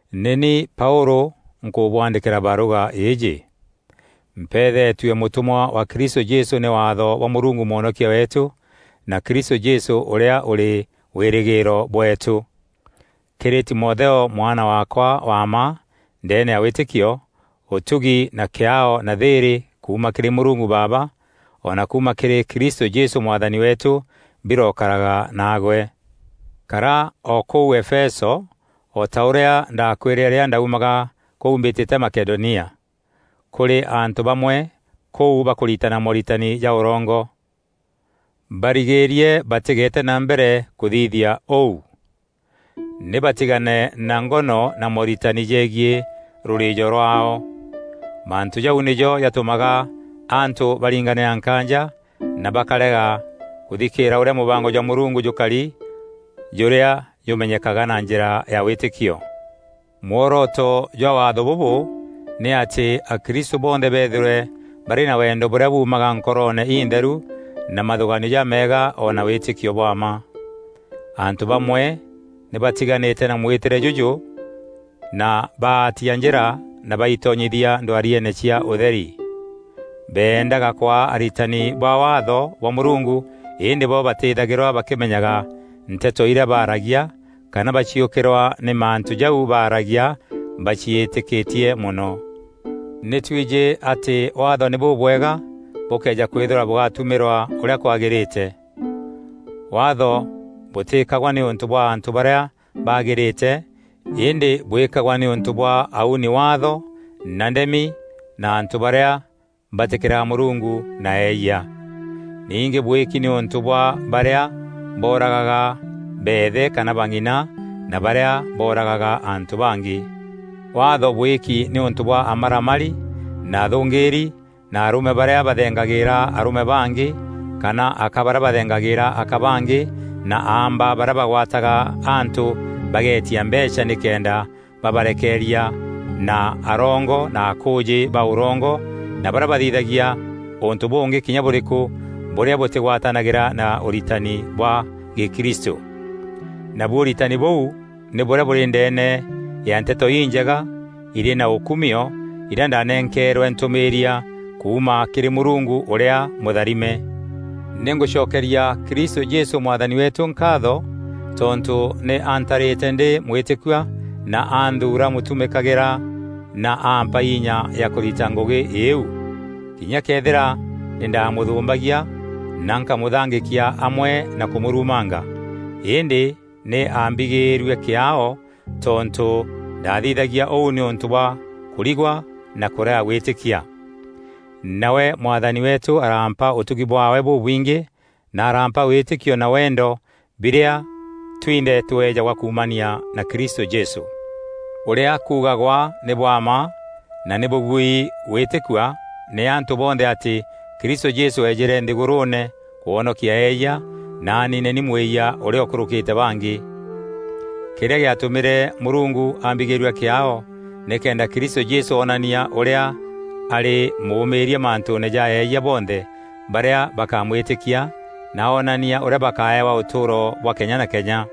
Nî ni Paûlû nkûbwandîkîra barûga îîjî. Mpeethetue mûtûmwa wa Kristû Jesû nî waatho bwa Mûrungu Mwonokia weetû na Kristû Jesû ûrîa ûrî wîrîgîîro bweetû. Kîrî Timotheo mwana waakwa wa mma ndeene ya wîtîkio, ûtugi na kîaao na thîîrî kuuma kîrî Mûrungu Baaba o na kuuma kîrî Kristû Jesû Mwathani weetû birokaraga naagwe. Kara o kûu Efeso, o ta ûrîa ndaakwîrîre rîrîa ndaumaga kûu mbîtîte Makedonia. Kûrî antû bamwe kûu bakûritana mooritani ja ûrongo. Barigîîrie batîgeete na mbere kûthithia ûu. Nî batigane na ngono na mooritani jegiî rûrîîjo rwaao. Mantû jau nîjo jatûmaga antû baringanîra nkaanja na bakarega kûthikîîra ûrîa mûbango jwa Mûrungu jûkari jûrîa jûmenyekaga na njîra ya wîtîkio. Mworoto jwa waatho bûbû nî atî akristû bonthe beethîrwe barî na wendo bûrîa buumaga nkoroone intheru na mathûgaanio jameega o na wîtîkio bwa mma. Antû bamwe nî batiganîte na mwîtîre jûjû na baatîa njîra na baitonyithia ndwariene cia ûtheri. Beendaga kwaa aritani ba Waatho bwa Mûrungu îndî bo batîîthagîrwa bakîmenyaga nteto irîa baaragia kana baciûkîrwa nî mantû jau baaragia baciîtîkîtie mono. Nî twijî atî Waatho nî bûbwega bûkëeja kwîthîrwa bûgatumîrwa ûrîa kwagîrîte. Waatho bûtîkagwa nîûntû bwa antû barîa baagîrîte îndî bwîkagwa nîûntû bwa auni Waatho na ndemi na antû barîa batîkîraga Mûrungu na eeyia. Ningî bwîki nîûntû bwa barîa booragaga beethe kana bang'ina na barîa booragaga antû bangî. Waatho bwîkî nîûntû bwa amaramari na athûngîîri na arûme barîa bathengagîîra arûme bangî kana aka barîa bathengagîîra aka bangî na aamba barîa bagwataga antû bageetia mbeecha nîkenda babarekeeria na arongo na akûûjî ba ûrongo na barîa bathithagia ûntû bûngî kinya bûrîkû bûrîa bûtîgwatanagîra na ûritani bwa gîkristû. Nabu ûritani bûu nî bûrîa bûrî ndeene ya Nteto Injega irî na ûkumio irîa ndaanenkeerwe ntûmîîria kuuma kîrî Mûrungu ûrîa mûtharime. Nî ngûcokeria Kristû Jesû Mwathani weetû nkaatho tontû nî antarîte ndî mwîtîkua na anthuura mûtumîkagîra na ampa inya ya kûrita ngûgî îîu, kinya këethîra nî ndamûthûmbagia na nkamûthangîkia amwe na kûmûrumanga. Îndî nî aambigîîrue kîaao tontû ndaathithagia ûu nîûntû bwa kûrigwa na kûrega gwîtîkia. Nawe Mwathani weetû arampa ûtugi bwaawe bûbwingî na arampa wîtîkio na wendo birîa twinthe tweejagwa kuumania na Kristû Jesû. Ûrîa kuugagwa nî bwa mma na nî bûbuîri gwîtîkua nî antû bonthe atî Kristû Jesû eejîre nthîgûrûûne kwonokia eeyia, naani nî ni mwîyia ûrîa ûkûrûkîte bangî. Kîrîa gîatûmîre Mûrungu ambigîîrua kîaao nîkenda Kristû Jesû onania ûrîa arî mûûmîîria mantûûne ja eeyia bonthe barîa bakamwîtîkia na onania ûrîa bakaewa ûtûûro bwa kenya na kenya.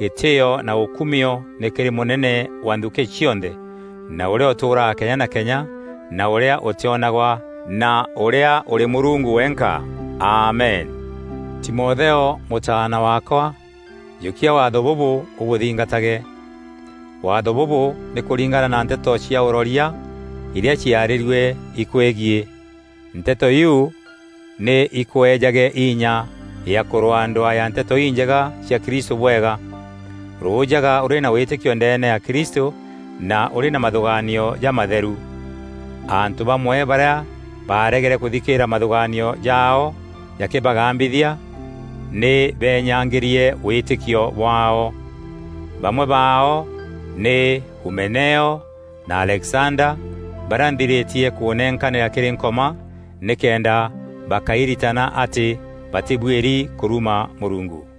Gîtîîo na ûkumio nî kîrî mûnene wa nthukî cionthe na ûrîa ûtûûraga kenya na kenya na ûrîa ûtîonagwa na ûrîa ûrî Mûrungu wenka. Amen. Timotheo mûtaana waakwa, jûkia waatho bûbû ûbûthingatage. Waatho bûbû nî kûringana na nteto cia ûroria irîa ciarîrue ikweegiî. Nteto iu nî ikweejage inya ya kûrwaa ndwaa ya Nteto Injega cia Kristû bwega. Rûûjaga ûrî na wîtîkio ndeene ya Kristû na ûrî na mathûgaanio jamatheru. Antû bamwe barîa baaregere kûthikîîra mathûgaanio jaao jakîbagambithia nî beenyangîrie wîtîkio bwaao. Bamwe baao nî Humeneo na Alexanda barîa nthirîtie kûnenkanîra kîrî Nkoma nîkenda bakairitana atî batîbuîri kûruma Mûrungu.